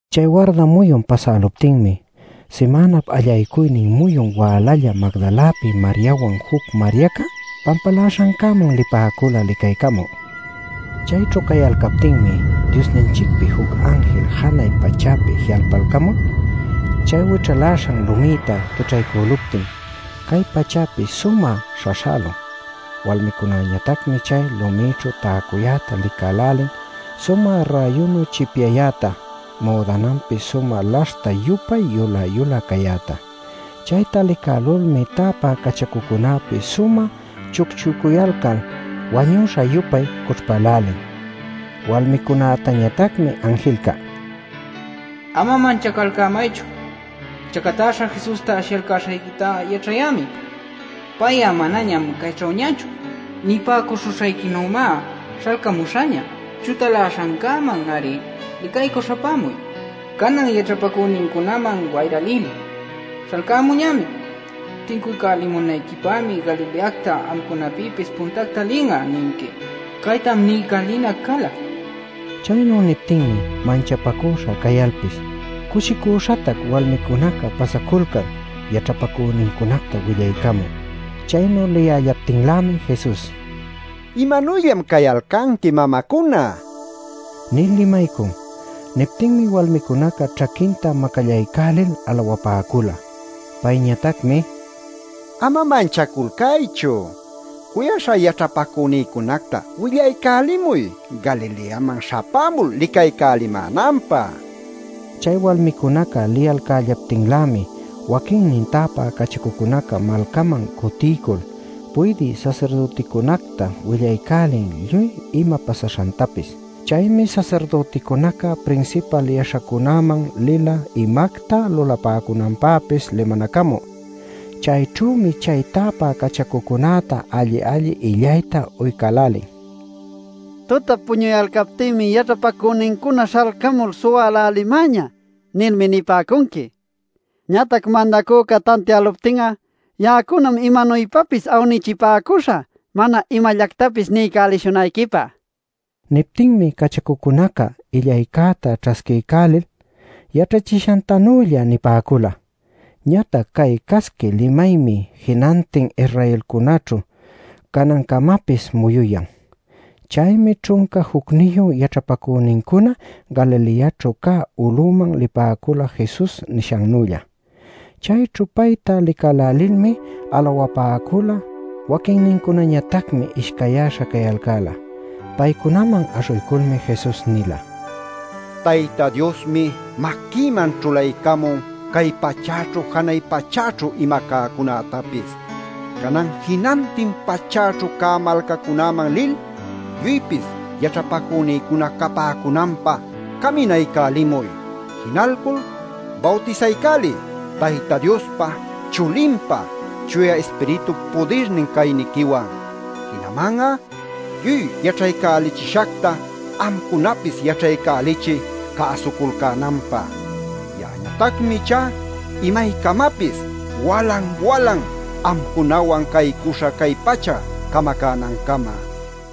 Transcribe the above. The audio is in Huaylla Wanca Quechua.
Chay warda muyun pasäluptinmi, simänap allaycuynin muyun wälalla Magdalapi Mariawan juc Mariaca pampaläśhancäman lipäcula licaycamü. Chayćhu cayalcaptinmi Diosninchicpi juc anjil janay pachäpi ji'alpalcamul chay wićhaläśhan lumïta quićhaycüluptin cay pachäpis sumä śhaśhälun. Walmicunäñatacmi chay lumïćhu täcuyäta licälälin sumä räyunu chipyayäta müdananpis sumä laśhta-yupay yulä-yulä cayäta. Chayta licälulmi täpä cachacucunäpis sumä chucchucuyalcal wañuśha-yupay cućhpälälin. Walmicunätañatacmi anjilca: “Ama manchacalcämaychu. Chacatäśha Jesusta ashiyalcäśhayquita yaćhayämi. Pay'a manañam cayćhüñachu. Nipäcuśhuśhayquinümá śhalcämuśhaña. Chutaläśhancäman-ari licaycü śhapämuy. Canan yaćhapacünincunaman wayra lil: ‘¡Śhalcamuñämi! Tincuycälimunayquipämi Galileacta amcunapïpis puntacta lin'a’ ninqui. Caytam niycälinac cala” nin. Chaynu niptinmi manchapacüśha cayalpis, cushicüśhatac walmicunaca pasaculcan yaćhapacünincunacta willaycamü. Chaynu liyällaptinlämi Jesus: “¿Imanuyllam cayalcanqui mamacuna?” nil limaycun. Niptinmi walmicunaca ćhaquinta macallacaycälil alawapäcula. Payñatacmi: “Ama manchaculcaychu. Cuyaśhá yaćhapacünïcunacta willaycälimuy Galileaman śhapämul licaycälimänanpä” nin. Chay walmicunaca liyalcällaptinlämi, waquinnin täpä cachacucunaca malcaman cutiycul puydï sasirdüticunacta willaycälin lluy ima pasaśhantapis. Chaymi sasirdüticunaca prinsipal yaśhacunäman lila imacta lulapäcunanpäpis limanacamü. Chayćhümi chay täpä cachacucunäta alli-alli illayta uycälälin: “ ‘Tutap puñuyalcaptïmi yaćhapacünincuna śhalcamul suwälälimäñä’ nilmi nipäcunqui. Ñatac mandacüca tantiäluptin'a ya'acunam imanuypapis awnichipäcuśhä mana imallactapis niycälishunayquipä” nil. Niptinmi cachacucunaca illaycäta ćhasquiycälil, yaćhachishantanülla nipäcula. Ñatac cay casqui limaymi jinantin Israelcunäćhu canancamapis muyuyan. Chaymi ćhunca jucniyu yaćhapacünincuna Galileaćhu cä ulüman lipäcula Jesus nishannülla. Chayćhu payta licälälilmi alawapäcula; waquinnincunañatacmi ishcayyäśha cayalcäla. Paycunaman aśhuyculmi Jesus nila: “Tayta Diosmi maquïman ćhulaycamun cay pachäćhu janay pachäćhu ima cäcunätapis. Canan jinantin pachäćhu cä malcacunäman lil lluypis yaćhapacünïcuna capäcunanpä caminaycälimuy. Jinalcul bawtisaycäliy Tayta Diospa, Chulinpa, Chuya Ispiritup pudirnin cayniquiwan. Jinaman'a lluy yaćhaycälichishacta amcunapis yaćhaycälichiy cäsuculcänanpä. Ya'añatacmi ichá imaycamapis walan-walan amcunawan caycuśhä cay pacha camacänancama” nil.